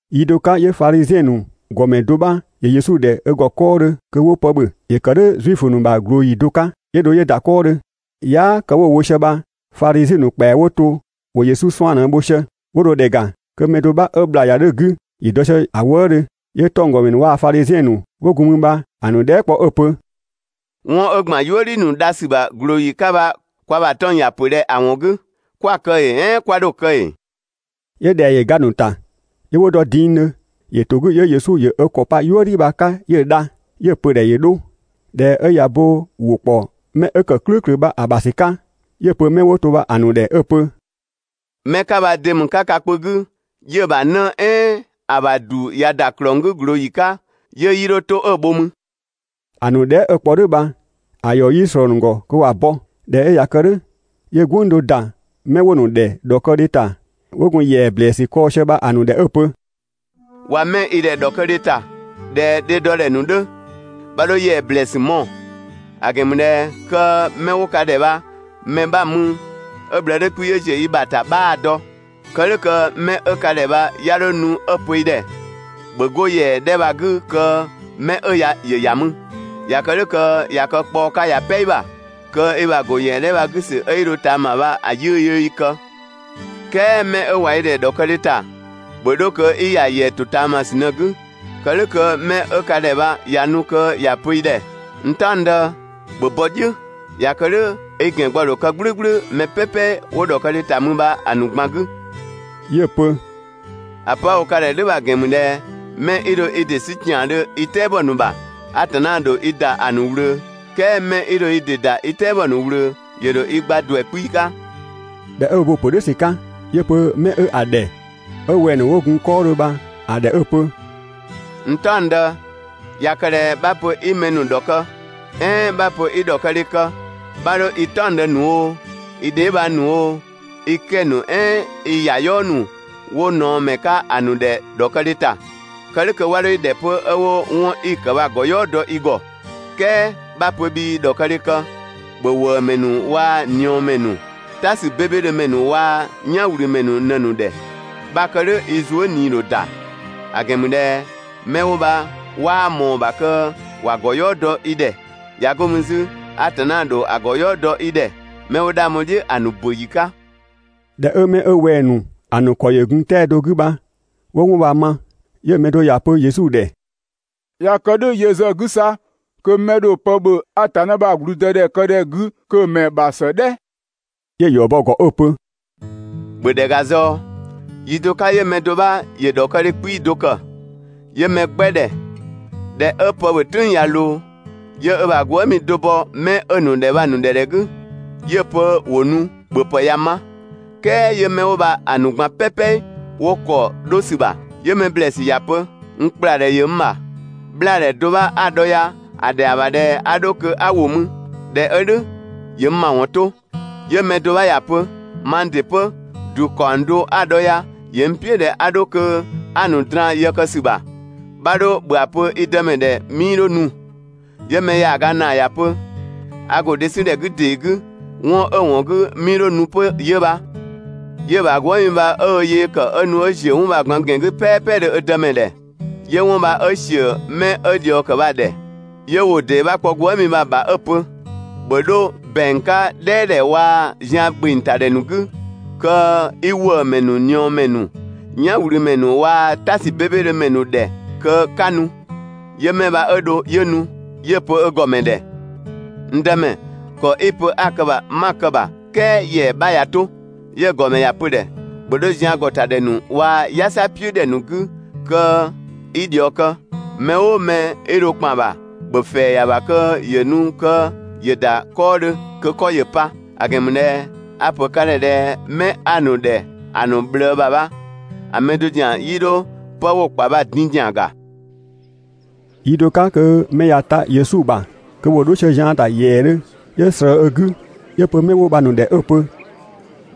Yi do 'ka 'yö Fadhiziɛn ‑nu ‑gɔmɛ do 'bha ‑yö Yesu ‑dhɛ ö ‑gɔ 'kɔɔdhö kö 'wo pë ‑bhö. ‑Yö ‑kë "dhʋ̈ Zuifö ‑nu ‑bha ꞊glooyi do 'ka. 'Yö dho 'yö ‑da 'kɔɔdhö. Yaa" kë 'wo wo sië bha Fadhiziɛn ‑nu ‑kpɛa 'wo to ‑wo Yesu 'suan‑ ꞊në‑ bho sië. 'Wo dho ‑dhɛ ‑ga kö mɛ do 'bha 'ö ‑bhla ‑yua 'dhö‑ 'gü ‑yö dɔ sië‑ wëëdhö. 'Yö 'tɔnggɔmɛ ‑nu waa‑ Fadhiziɛn ‑nu 'wo gun mü bha‑ ‑nu dhɛɛ" kpɔ 'ö‑ pö: «'Wɔn 'ö ‑gban "yuëdhi ‑nu dha ‑sü ‑bha ꞊glooyi 'ka bha kwa ‑bha 'tɔng‑ ‑ya ‑pö ꞊dhɛ ‑a ‑wɔn 'gü? 'Kwa‑ kë ‑ee "ɛɛn 'kwa 'dho‑ ‑kë ‑ee?» 'Yö ‑dhɛa ‑yö ga‑ ‑nu ‑ta, 'yö 'wo dɔ dingdhö. ‑Yö ‑to 'gü 'yö Yesu ‑yö ö ‑kɔ pa "yuëdhi bha‑ 'ka 'yö‑ dha, 'yö‑ pö‑ ‑dhɛ ‑yö 'dho. ꞊Dhɛ 'ö ꞊ya bo ‑wʋ ‑kpɔ 'mɛ 'ö‑ ‑kë "klʋ̈ʋ̈klʋ̈ bha‑ ‑bha ‑sü 'ka, 'yö‑ pö 'mɛ 'wo to‑ ‑nu ‑dhɛ 'ö‑ pö: «'Mɛ 'ka bha de ‑mü 'ka ka kpö 'gü 'yö‑ ‑bha 'në "ɛɛn ‑a ‑bha ‑du ꞊ya ‑da ‑klɔng 'gü ꞊glooyi 'ka, 'yö 'yii 'dho 'to 'ö‑ bho mü? ‑An dhɛɛ" 'ö‑ kpɔ "dhʋ̈ bha, ‑a ‑yɔ 'yii ꞊slɔɔ‑ ‑nu ‑gɔ kö ‑wa bɔ. ꞊Dhɛ 'ö ꞊ya kë "dhʋ̈, 'yö "gwënng do ‑da 'mɛ 'wo‑ ‑nu ‑dhɛ ‑dhɔkëdhe ‑ta 'wo gun ‑yɛa ‑blɛɛsü kɔɔ‑ sië bha‑ ‑nu ‑dhɛ 'ö‑ pö: «꞊Wa 'mɛ i ‑dhɛ ‑dhɔkëdhe ‑ta, ꞊dhɛ dhe dɔ ‑dhɛ ‑nu 'dhö, 'bha 'dho ‑yɛa ‑blɛɛsü mɔɔ‑, ‑a ‑gɛn ‑mü ꞊dhɛ 'kö 'mɛ 'wo ka ‑dhɛ bha‑ mɛ 'bha‑ mü 'ö‑ ꞊bhlëë 'dhö 'kpii‑ 'ö ‑ziö i ‑bha ‑ta 'bhaa‑ dɔ. Kë "dhʋ̈ kö 'mɛ 'ö ka ‑dhɛ bha 'ya 'dho nu 'ö‑ pö i ‑dhɛ: ‹‑Bhö 'go ‑yɛa 'dhɛ bha‑ 'gü kö 'mɛ 'ö ya ‑yö ‑ya mü›. ꞊Ya kë "dhʋ̈ kö ꞊ya kë kpaɔ 'ka ꞊ya "pɛ i ‑bha. Kö i ‑bha ‑go ‑yɛa 'dhɛ bha‑ 'gü ‑sü kö 'i 'dho ‑ya ꞊taama bha‑ 'yiʋ̈‑ yöö i kë. "Kɛɛ 'mɛ 'ö ꞊wa i ‑dhɛ ‑dhɔkëdhe ‑ta, ‑bhö 'dho kö 'i ‑ya ‑yɛa ‑totaamasü ꞊në‑ 'gü, kë "dhʋ̈ kö 'mɛ 'ö ka ‑dhɛ bha ꞊ya nu kö ‑ya pö i ‑dhɛ: «N "taɔngdë, ‑bhö bɔ "dhiʋ̈!» ꞊Ya kë "dhʋ̈, i ‑gɛngbɔ ‑dho kë "gblʋ̈gblʋ̈ mɛ "pɛpɛ 'wo ‑dhɔkëdhe ‑ta mü bha‑ ‑nu ꞊gban 'gü.» 'Yö‑ pö: «‑A pö 'a‑ wo ka ‑dhɛ "dhʋ̈ bha‑ ‑gɛn ‑mü ꞊dhɛ 'mɛ 'i dho i ‑dɩ 'sü ‑kiandhö i "tɛabɔ ‑nu ‑bha, Atanna ‑dho i ‑da ‑a ‑nu ꞊wlöö, "kɛɛ 'mɛ 'i dho i ‑dɩ ‑da i "tɛabɔ ‑nu ꞊wlöö, ‑yö ‑dho i gba ‑duɛ 'kpii‑ 'ka.» ꞊Dhɛ 'ö ö bo‑ ‑pö "dhʋ̈ ‑sü 'ka, 'yö‑ pö 'mɛ 'ö‑ ‑dhɛ 'ö wɛng‑ ‑nu 'wo gun‑ ‑gɔ 'kɔɔdhö bha‑ ‑dhɛ 'ö‑ pö: «N "taɔngdë, ꞊ya kë ꞊dhɛ 'bha‑ pö 'i mɛ ‑nu ‑dhɔkë, "ɛɛn 'bha‑ pö 'i ‑dhɔkëdhe kë, 'bha 'dho i "taɔngdë ‑nu oo, i dheebhang ‑nu oo, i 'kɛ‑ ‑nu "ɛɛn i ‑yayɔɔ ‑nu 'wo ꞊naɔmɛ 'ka ‑a ‑nu ‑dhɛ ‑dhɔkëdhe ‑ta, kë "dhʋ̈ kö 'wa 'dho i ‑dhɛ 'pö 'ö 'wo 'wɔn 'i‑ ‑kë bha‑ ‑gɔyɔɔ dɔ i ‑gɔ. "Kɛɛ 'bha‑ pö bhii ‑dhɔkëdhe kë, ‑bhö ‑wëëmɛ ‑nu waa‑ ꞊niɔɔmɛ ‑nu, "ta ‑sü 'bebedhö ‑mɛ ‑nu waa‑ "yanwlümɛ ‑nu ꞊në‑ ‑nu ‑dhɛ. 'Bha‑ kë "dhʋ̈, i zuë" ꞊nii ‑dho ‑da, ‑a ‑gɛn ‑mü ꞊dhɛ 'mɛ 'wo bha 'waa ꞊mɔɔ‑ ‑bha kö ‑wa ‑gɔyɔɔ dɔ i ‑dhɛ, ꞊ya 'go mü 'zü, Atanna ‑dho ‑a ‑gɔyɔɔ dɔ i ‑dhɛ, 'mɛ 'wo 'dhang bho‑ "dhiʋ̈ ‑a ‑nu ‑bö ‑yi 'ka. ꞊Dhɛ 'ö 'mɛ 'ö wɛng‑ ‑nu ‑a ‑nu ‑kɔ ‑yö gun 'tɛa‑ do 'gü bha 'wo 'wɔn bha‑ ma, 'yö‑ mɛ do ‑ya pö Yesu ‑dhɛ: «꞊Ya kë "dhʋ̈ yö ‑zë 'gü 'sa kö 'mɛ 'ö dho pë ‑bhö Atanna ‑bha ‑gblüdëdhɛkëdhɛ 'gü kö‑ ‑mɛ ‑bha ‑së "dhɛ!» 'Yö‑ ‑yɔ bɔ‑ ‑gɔ 'ö‑ pö: «‑Bhö ‑dhɛ ‑ga zɔɔ, yi do 'ka 'yö mɛ do 'bha ‑yö ‑dhɔkëdhe 'kpii‑ do ‑kë, 'yö mɛ 'gbɛ ‑dhɛ. ꞊Dhɛ 'ö pë ‑bhö "tʋ̈ng ꞊ya ꞊loo, 'yö ö ‑bha gwëëmi do bɔ 'mɛ 'ö‑ ‑nu ‑dhɛ bha‑ ‑nu ‑dhɛ ‑dhɛ 'gü 'yö‑ pö ‑wo nu, ‑bhöpë ꞊ya ma. "Kɛɛ 'yö 'mɛ 'wo bha‑ ‑nu ꞊gban "pɛpɛ 'wo ‑kɔ 'dho ‑sü ‑bha. 'Yö mɛ ‑blɛɛsü ‑ya pö: «N ‑kpladhɛ ‑yö n ‑bha, 'bhlaadhɛ do 'bha 'a‑ dhɔ ya, ‑a ‑dhɛa ‑bha ꞊dhɛ 'a 'dho kö 'a ‑wo mü, ꞊dhɛ 'ö "dhʋ̈ ‑yö n ‑mawɔn 'to.» 'Yö‑ mɛ do 'bha ‑ya pö: «Mang ‑dɩ 'pö, ‑du ‑kaɔng do 'a‑ dhɔ ya, ‑yö n "piʋ̈ ꞊dhɛ 'a dho kö 'a‑ ‑nu draan‑ yë kë ‑sü ‑bha. 'Bha 'dho ‑bhö ‑a pö i dëmɛ ‑dhɛ 'mii 'dho nu.» 'Yö‑ mɛ ‑yaaga ‑naa ‑ya pö: «A ‑go dhe 'sü ‑dhɛ 'gü ‑dee 'gü, 'wɔn 'ö‑ ‑wɔn 'gü 'mii 'dho nu 'pö 'yö bha.» 'Yö‑ ‑bha gwëëmi bha 'ö ö yee kë 'ö nu 'ö ‑ziö 'wɔn bha‑ ꞊gban ‑gɛn 'gü "pɛɛpɛdhö ö dëmɛ ‑dhɛ, 'yö 'wɔn bha 'ö ‑siö 'mɛ 'ö ꞊dhiɔ kë bha‑ ‑dhɛ. 'Yö ‑wʋ ‑dee 'bha kpɔ gwëëmi bha‑ ‑bha 'ö‑ pö: «‑Bhö 'dho ‑bɛang 'ka "dhɛɛdhɛ waa‑ zian ‑gbeng ‑ta ‑dhɛ ‑nu 'gü kö 'i ‑wëëmɛ ‑nu, ꞊niɔɔmɛ ‑nu, "yanwlümɛ ‑nu waa‑ "ta ‑sü 'bebedhö ‑mɛ ‑nu ‑dhɛ kö 'ka nu.» 'Yö 'mɛ bha 'ö dho 'yö nu, 'yö‑ pö ö ‑gɔmɛ ‑dhɛ: «N dëmɛ, ‑kɔ 'i‑ pö 'a‑ kë‑ ‑bha bha 'ma‑ kë‑ ‑bha, "kɛɛ ‑yɛa 'bha ꞊ya 'to.» 'Yö‑ ‑gɔmɛ ‑ya pö‑ ‑dhɛ: «‑Bhö 'dho zian ‑gɔ ‑ta ‑dhɛ ‑nu waa‑ "yasa "piʋ̈ ‑dhɛ ‑nu 'gü kö 'i ꞊dhiɔ kë, mɛ "ʋʋ mɛ 'i dho ‑kpan ‑bha, ‑bhö ‑fɛɛ ‑ya ‑bha kö ‑yö nu kö ‑yö ‑da 'kɔɔdhö kö 'kɔ ‑yö pa; ‑a ‑gɛn ‑mü ꞊dhɛ a‑ ‑pö ka ‑dhɛ ꞊dhɛ 'mɛ 'a‑ ‑nu ‑dhɛ ‑a ‑nu ꞊bhlëë ‑bha bha‑ mɛ do ‑zian 'yii dho 'pë 'wo‑ ‑kpa bha‑ din ‑zian ‑ga.» Yi do 'ka kö mɛ ꞊ya ta Yesu ‑bha kö ‑wo 'dho sië zian ‑ta ‑yɛɛdhö, 'yö ꞊slëë ö 'gü 'yö‑ pö 'mɛ 'wo bha‑ ‑nu ‑dhɛ 'ö‑ pö: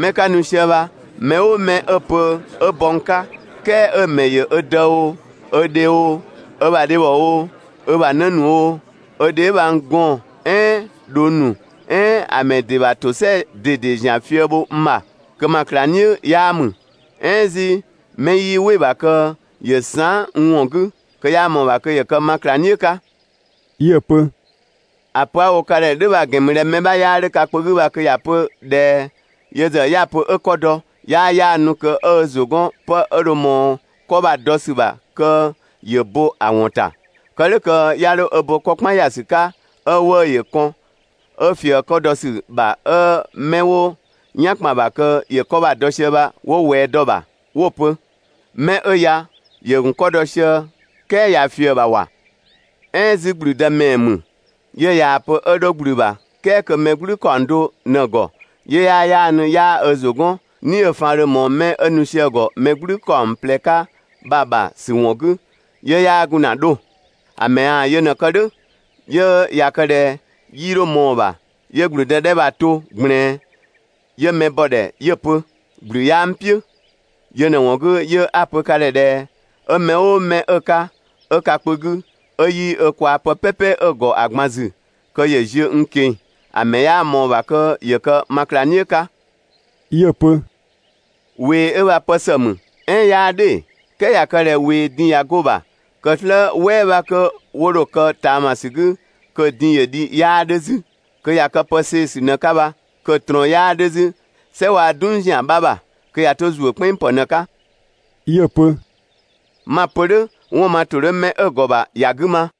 «'Mɛ 'ka nu sië bha mɛ "ʋʋ mɛ 'ö‑ pö 'ö bɔ n 'ka, "kɛɛ 'ö‑ ‑mɛ ‑yö ö dë oo, ö dhe oo, ö ‑bha dhebhɔ oo, ö ‑bha 'në ‑nu oo, ö dheebhang gɔɔn‑ ‑nu "ɛɛn dhong ‑nu "ɛɛn ‑a ‑mɛ ‑dɩ ‑bha ‑tosɛa ꞊dede ‑zian fië bho n ‑bha, kö ma ꞊klangdhiʋ̈ 'yaa ‑mü. "Ɛɛn 'zü 'mɛ 'yii "wɩ‑ ‑bha kö ‑yö saan" n ‑wɔn 'gü, kö 'yaa ꞊mɔɔ‑ ‑bha kö ‑yö kë ma ꞊klangdhiʋ̈ 'ka.» 'Yö‑ pö: «‑A pö 'a‑ wo ka ‑dhɛ "dhʋ̈ bha‑ ‑gɛn ‑mü ꞊dhɛ mɛ 'bha 'yaa 'dhö ka kpö 'gü bha kö ‑ya pö ꞊dhɛ yö ‑zë 'ya‑ pö 'ö 'kɔ dɔ, 'yaa 'yaanu kö ‑yö ö ‑zʋ 'gɔn 'pë 'ö dho ꞊mɔɔ 'kɔ bha‑ dɔ ‑sü ‑bha kö ‑yö bo‑ ‑wɔn ‑ta, kë "dhʋ̈ kö 'ya 'dho ö bo 'kɔkpan ‑ya ‑sü 'ka 'ö 'wëë‑ ‑yö kɔn, 'ö ꞊fië‑ 'kɔ dɔ ‑sü ‑bha 'ö mɛ 'wo "yan ‑kpan bha kö ‑yö 'kɔ bha‑ dɔ sië bha 'wo ꞊wɛɛ dɔ ‑bha 'wo‑ pö: «'Mɛ 'ö ya, ‑yö ‑gun 'kɔ dɔ sië "kɛɛ ꞊ya ꞊fië‑ ‑bha ‑wa! "Ɛɛn 'zü ‑gblüdë ‑mɛɛ ‑mü, 'yö ꞊yaa‑ pö 'ö 'dho ‑gblü bha, "kɛɛ kö mɛ "gblü ‑kaɔng do ꞊në‑ ‑gɔ, 'yö 'yaa 'yaanu 'yaa ö ‑zʋ 'gɔn "ni 'ö‑ faan dho ꞊mɔɔ 'mɛ 'ö nu sië‑ ‑gɔ mɛ "gblü ‑kaɔng ꞊plɛ 'ka bha‑ ‑bha ‑sü ‑wɔn 'gü, 'yö 'yaa gun ‑na 'dho‑? ‑A ‑mɛ ꞊yaa‑ yö ꞊në‑ kë "dhʋ̈, 'yö ꞊ya kë ꞊dhɛ 'yii 'dho ꞊mɔɔ‑ ‑bha, 'yö ‑gblüdë 'dhɛ bha‑ to ꞊gblɛɛn, 'yö mɛ bɔ‑ ‑dhɛ 'yö‑ pö: «‑Gblü 'yaa n "piʋ̈». Yö ꞊në‑ ‑wɔn 'gü, 'yö 'a‑ pö ka ‑dhɛ ꞊dhɛ 'ö mɛ "ʋʋ mɛ 'ö‑ 'ka 'ö ka kpö 'gü 'ö 'yii ö kwaa‑ pë "pɛpɛ 'ö‑ ‑gɔ ‑a ꞊gban ‑zü, kö ‑yö ziö n ꞊keng‑, ‑a ‑mɛ 'yaa ꞊mɔɔ‑ ‑bha kö ‑yö kë ma ꞊klangdhiʋ̈ 'ka.» 'Yö‑ pö: «꞊Wee 'ö bha pë ‑së ‑mü, "ɛɛn 'yaa "dhʋ̈ ‑ee? "Kɛɛ ꞊ya kë ꞊dhɛ ꞊wee din ꞊ya 'go‑ ‑bha kö "slë "wɛɛ 'bha 'kö 'wo dho‑ kë ꞊taamasü 'gü kö‑ din ‑yö dhi 'yaa 'dhö 'zü. Kö ꞊ya kë pë see‑ ‑sü ꞊në‑ 'ka bha, kö‑ ꞊trɔɔn 'yaa 'dhö 'zü "sɛ waa‑ "dung ‑zian 'bha ‑bha. Kö ꞊ya 'to ‑zuö "kpɛnng ‑pë ꞊në‑ 'ka.» 'Yö‑ pö: «'Ma‑ pö "dhʋ̈, 'wɔn ma ‑tʋ 'dhö 'mɛ 'ö‑ ‑gɔ ‑bha ‑ya 'gü ma!»